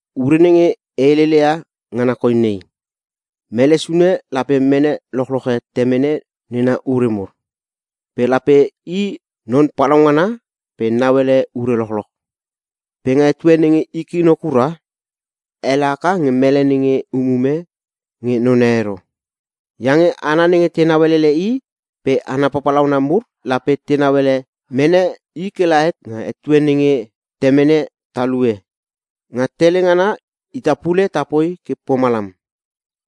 Ure nenge e helele ia ngana koi nei: Mele sune lape mene lochloche temene nena ure mur. Pe lape i non palaungana pe nauele ure lochloch. Pe nga etue nenge i kino kura, ele haka nge mele nenge umume nge none ero. Iange hana nenge tenau elele i pe hana papalauna mur lape tenau ele mene i ke la het nga etue nenge temene talue. Nga tele ngana ita pule tapoi ke pomalam.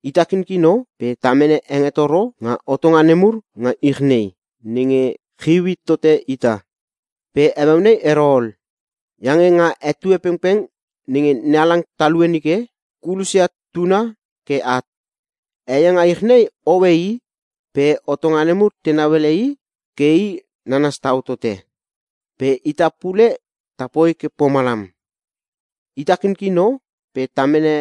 Ita kinkino pe ta mene hengetoro nga hotonga nemur nga ich nei, nenge chiu hit tote ita. Pe heueu nei ero ol. Iange nga ana etue pengpeng nenge NeHalang talue nike, kulosia tuna ke at. Hei e nga ich nei hoe I. Pe hotonga nemur tenau ele I ke I nanas tau tote. Pe ita pule tapoi ke pomalam. Ita kinkino pe ta mene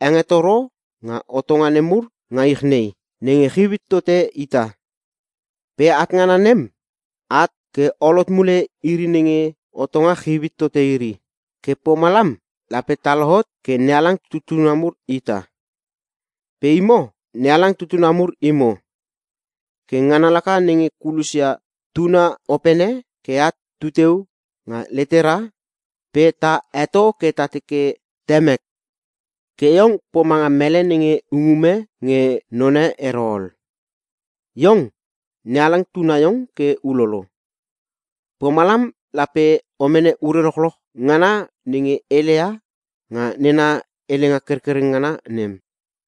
hengetoro nga hotonga nemur nga ich nei, nenge chiu hit tote ita. Pe at ngana nem, at ke ol hot mule iri nenge hotonga chiu hite iri. Ke pomalam lape ta lohot ke NeHalang tutuna mur ita. Pe imo, NeHalang tutuna mur imo. Ke ngana laka nenge kulosia Tuna Opene ke at tu teu nga letera pe ta heto ke ta teke, “Temek.” Ke iong pomanga mele nenge umume nge none ero ol. Iong, NeHalang tuna iong ke ulolo, pomalam lape o mene ure lochloch ngana nenge heleia nga nena helenga kerkereng ngana nem.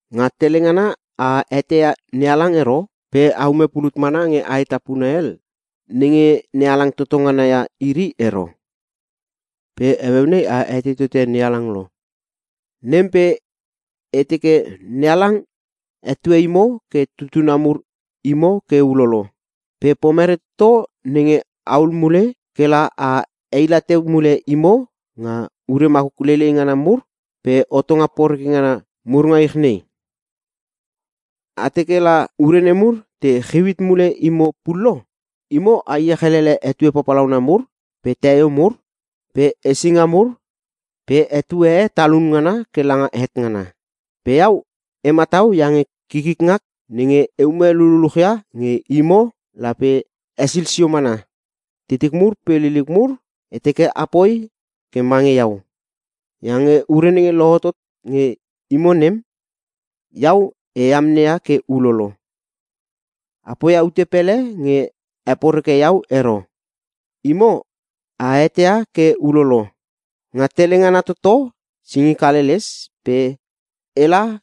Nga tele ngana a eteia NeHalang ero pe a ume pulut mana nge aetapuna hel, nenge Nehalang toto ngana ia iri ero. Pe heueu nei a etei tote NeHalang lo, nem pe e teke NeHalang hetue imo ke tutuna mur imo ke ulolo. Pe pomerei toto nenge ahul mule ke la a heila teu mule imo nga ure makuk leilei ngana mur pe hotonga porekreke ngana mur nga ich nei? A teke la ure nemur te chiu hit mule imo pullo? Imo a iech elele etue papalauna mur pe teio mur pe hesinga mur pe etue e talun ngana ke langa het ngana! Pe iau, e matau iange kikik ngak nenge e ume lululuchia nge imo lape hesil sio mana. Titik mur pe liliuk mur, e teke apoi ke mange iau. Iange ure nenge lohotot nge imo nem, iau e amneia ke ulolo. A poia ute pele nge heporeke iau ero. Imo a eteia ke ulolo. Nga tele ngana toto singik haleles pe ela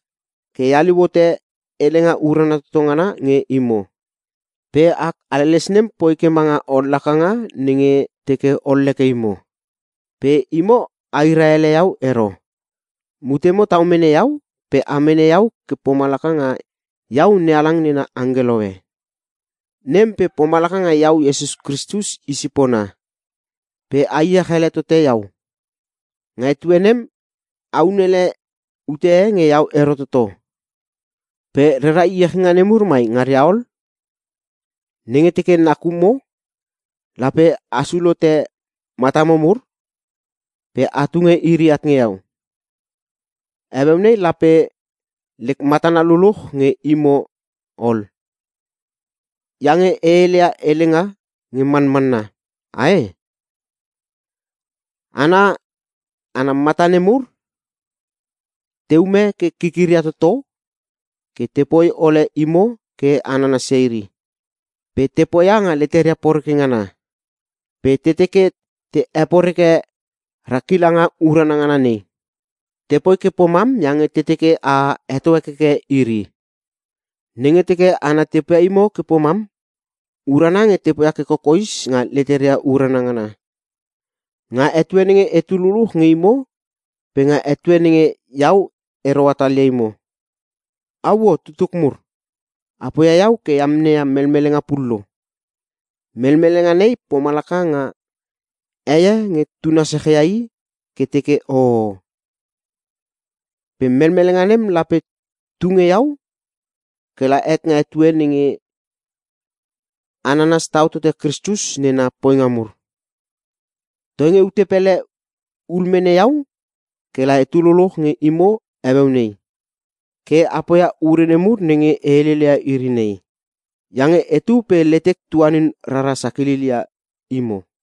ke e haliu hote Helenga Urana Toto Ngana nge imo. Pe ak haleles nem poi ke manga ollakanga nenge teke olleke imo. Pe imo a hira ele iau ero. Mutemo tau mene iau pe a mene iau ke pomalaka nga iau NeHalang nena angkelo e. Nem pe pomalaka nga iau Iesus Kristus i sipona, pe a iech ele tote iau. Nga etue nem a unele ute nge iau ero toto. Pe rera iechinga nemur mai ngaria ol? Nenge teke nakumo, lape asul hote matamo mur pe a tunge iri at nge iau. Heueu nei lape lek matana luluch nge imo ol, iange e heleia helenga nge manmanna. Ae? Hana ana mata nemur teume ke kikiria toto ke tepoi ole imo ke a nanasia iri. Pe te poia nga leteria poreke ngana. Pe te teke te heporeke ra kilanga urana ngana nei. Tepoi ke pomam iange te teke a heto hekeke iri. Nenge teke hana te poia imo ke pomam, urana nge te poia ke kokoes nga leteria urana ngana. Nga etue nenge etu luluch nge imo pe nga etue nenge iau ero hatalia imo. Auo! Tutuk mur, a poia iau ke e amneia melmelenga pullo! Melmelenga nei pomalaka nga heie nge tuna sechia i ke teke hohoho. Pe melmelenga nem lape tu nge iau ke la het nga etue nenge a nanas tau tote Kristus nena poinga mur. Toinge ute pele ul mene iau ke la etu luluch nge imo heueu nei, ke poia ia ure nemur nenge e heleia iri nei. Iange etu pe letek tuanin rara sakilil ia imo.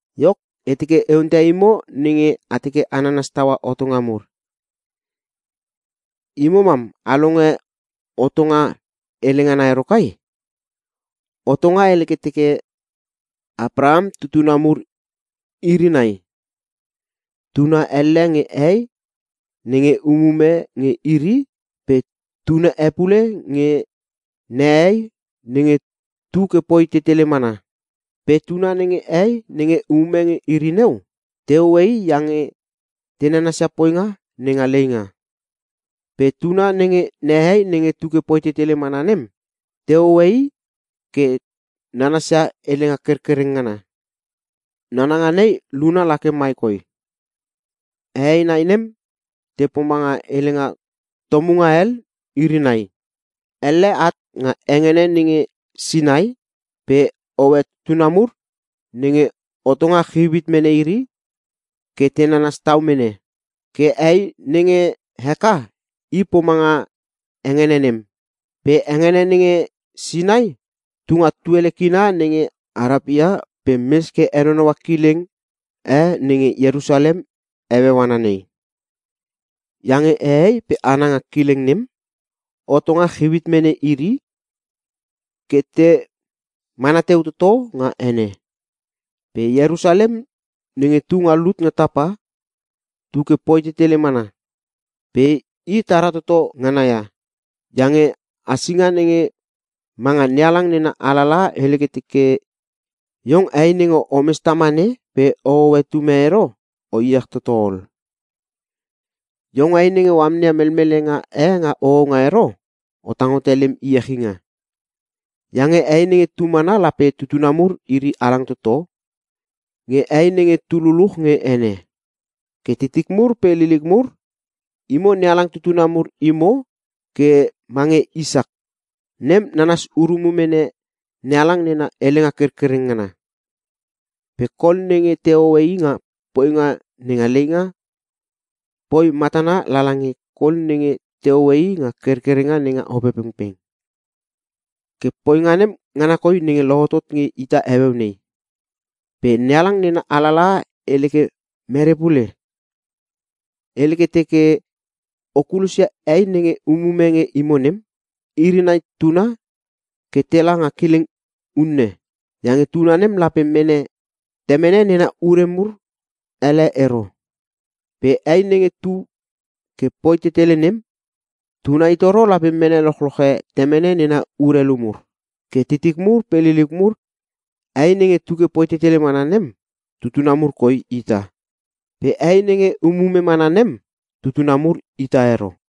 Iok, e teke e onteia imo nenge a teke a nanas taua hotonga mur: Imo mam a longe hotonga hele ngana ero kai? Hotonga hele ke teke, Apraham tutuna mur iri nai. Tuna elle nge hei nenge umume nge iri pe tuna e pule nge nehei nenge tu ke poi tetele mana. Pe tuna nenge hei nenge umume nge iri neu, tehoe i iange te nanasia poinga nenga leinga. Pe tuna nenge nehei nenge tu ke poi tetele mana nem, tehoe i ke nanasia helenga kerkereng ngana. Nananga nei luna la ke mai koi: Hehei nai nem te pomanga Helenga Tomunga Hel iri nai. Elle at nga hengene nenge Sinai pe hoe tutuna mur nenge hotonga chiu hit mene iri ke te nanas tau mene. Ke hei nenge Heka i pomanga hengene nem. Pe hengene nenge Sinai tu nga tuele kina nenge Arapia, pe mes ke henonoua kilenge nenge Ierusalem heueu ana nei. Iange hehei pe hana nga kileng nem, hotonga chiu hit mene iri ke te mana teu toto nga ene. Pe Ierusalem nenge tu nga lut nga tapa, tu ke poi tetele mana. Pe i tara toto ngana ia. Iange hasinga nenge manga NeHalang nena alalaha hele ke teke: “Iong hei nenge omes tamane pe ohoe tum e ero, o iech toto ol. Iong hei nenge o amneia melmelenga e nga hohonga ero, o tang hote lem iechinga. Iange hei nenge tu mana lape tutuna mur iri halang toto nge hei nenge tu luluch nge ene.” Ke titik mur pe liliuk mur, imo NeHalang tutuna mur imo ke mange Isak. Nem nanas urume NeHalang nena helenga kerkereng ngana. Pe kol nenge tehoe i nga poinga nenga leinga, poi matana lala nge kol nenge tehoe i nga kerkerenga nenga Opepengpeng. Ke poinga nem ngana koi lohotot nge ita heueu nei. Pe NeHalang na alalaha hele ke mere pule? Hele ke teke, “O kulosia hei nenge umume nge imo nem, iri nai tuna ke tela nga kileng unne. Iange tuna nem lape mene temene nena ure mur hele ero. Pe hei nenge tu ke poi tetele nem, tuna itoro lape mene lochloche temene nena urelu mur.” Ke titik mur pe liliuk mur, hei nenge tu ke poi tetele mana nem, tutuna mur koi ita. Pe hei nenge umume mana nem, tutuna mur ita ero.